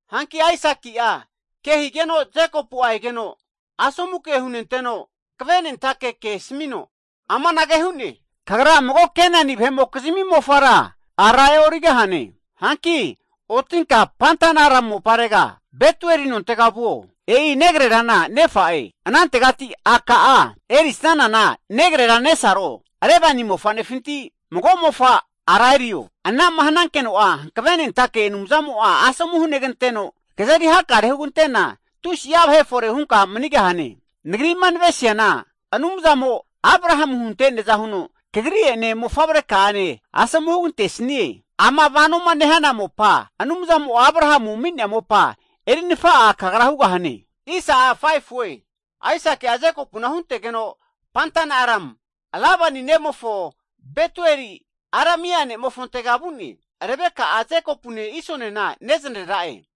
Hanki Aisaki'a ke higeno Jekopu egeno asomu hunenteno, hanvenentake ke asmino, kagra mago Kenani vahe'mokizmi mofara e'origahane. Otinka Padan-aram (Mesopotemia), Betuel nontega vuo, e'i negrerana nefa'e, anantegati a' ka'a erisanana Labani negrera nesaro mofanefinti mago mofa a'ra erio! Ana'ma hanankeno Hanvenentake Anumzamo asomu huganteno, kazeri hakare nehuno, kazeri hakare hugante'na tusi'a vahe fore hunka manigahane. Nagri'ma navesiana Anumzamo Abrahamu hunte'neaza huno kagri'ene, mofavreka'ane asomu hugantesnie, ama vanoma nehana mopa, Anumzamo Abrahamu ami'nea mopa eri nafa'a hugahane. Aisaki'a Jekopuna huntegeno Padan-aram (Mesopotemia) Labanintega vu'ne. Betueli Aramia nemofo mofavre, Rebeka nesaro, Jekopune Iso gizni neznarera'e.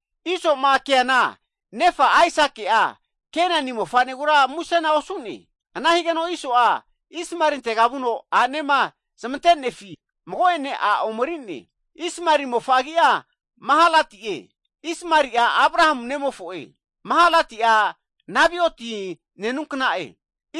Isoma keana nefa Aisaki'a Kenani mofanegura musena osu'ne. Ana higeno Iso'a Ismaelintega vu'no a'nema zamante'nefi aru mago'ene a' omeri'ne, Ismaeli mofa agi'a Mahalati'e, Ismaeli'a Abrahamu nemofo'e. Mahalati'a Nebaioti nenunkna'e.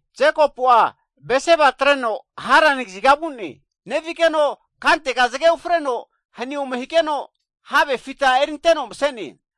Jekopu'a Bersiba atreno Harani kaziga vu'ne. Nevigeno kantega zge ufreno hani ome higeno, have fita erinteno mse'ne.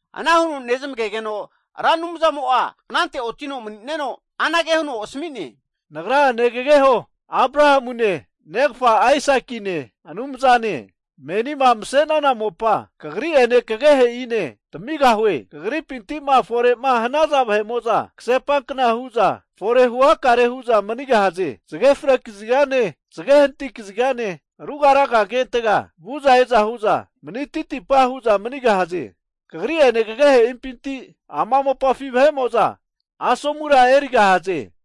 Ana huno nezmagegeno Ra Anumzamo anante ontino mani'neno asmi'ne, Nagra Ra Anumzane, negageho Abrahamune, negfa Aisakigizni Anumzane, Menima mase'nana mopa kagri'ene, kagehe'ine tamigahue. Kagripinti'ma fore hnaza vahe'mo'za kasepakna hu'za fore huhakare hu'za manigahaze. Zge fre kazigane, zge hanati kazigane, ruga raga agentega vu'za e'za hu'za mani titipa hu'za manigahaze. Kagri ene kagehe'impinti ama mopafi vahe'mo'za asomura erigahaze.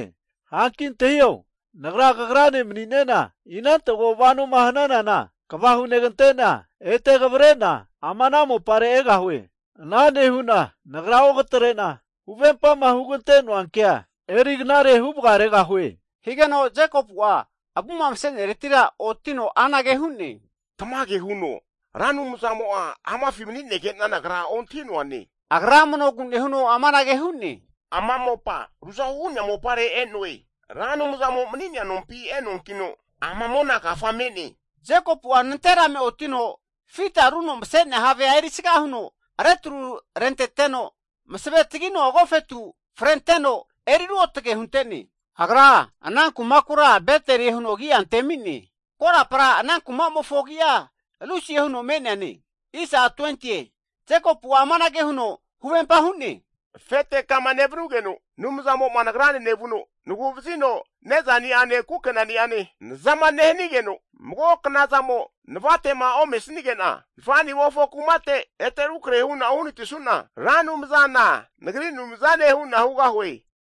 Hanki antahio Nagra, kagrane mani'nena, inantega vanoma hananana, kva hunegante'na, ete kavre'na ama ana mopare egahue. Hanige'na Nagra onkatre'na, kema huvempa hugante'noa kea eri knare huvgaregahue. Jekopu'a avu msenereti otino anage hu'ne, Tmage huno Ra Anumzana amafi mani'negena nagra ontahi'noane. Agra amnogu nehuno amanage hu'ne. Ama mopa ruotge huno me'ne! Ra Anumzamo mani'nea nompi e'noe. Hankino ama mona kafa me'ne. Jekopu'a nanterame otino, fitaruno mse'nea havea erisga huno retru renteteno, masve tagino agofetu frente'ne. Agra ana nonkura Beteli'e huno agia antemi'ne. Korapa ana kumamofo agi'a Lusi'e huno me'neane. Jekopu'a amanage huno huvempa hu'ne, Afete kama nevnugeno Anumzamo nagrane nevuno nagu'vazino ne'za ni'ane kukena'ni'ane naza nehanigena, mago knazamo navate osanige'nama nafa'nimofo kumate ete rukrahe hu'na uhanati su'na, Ra Anumzana, nagri Anumzane hugahue.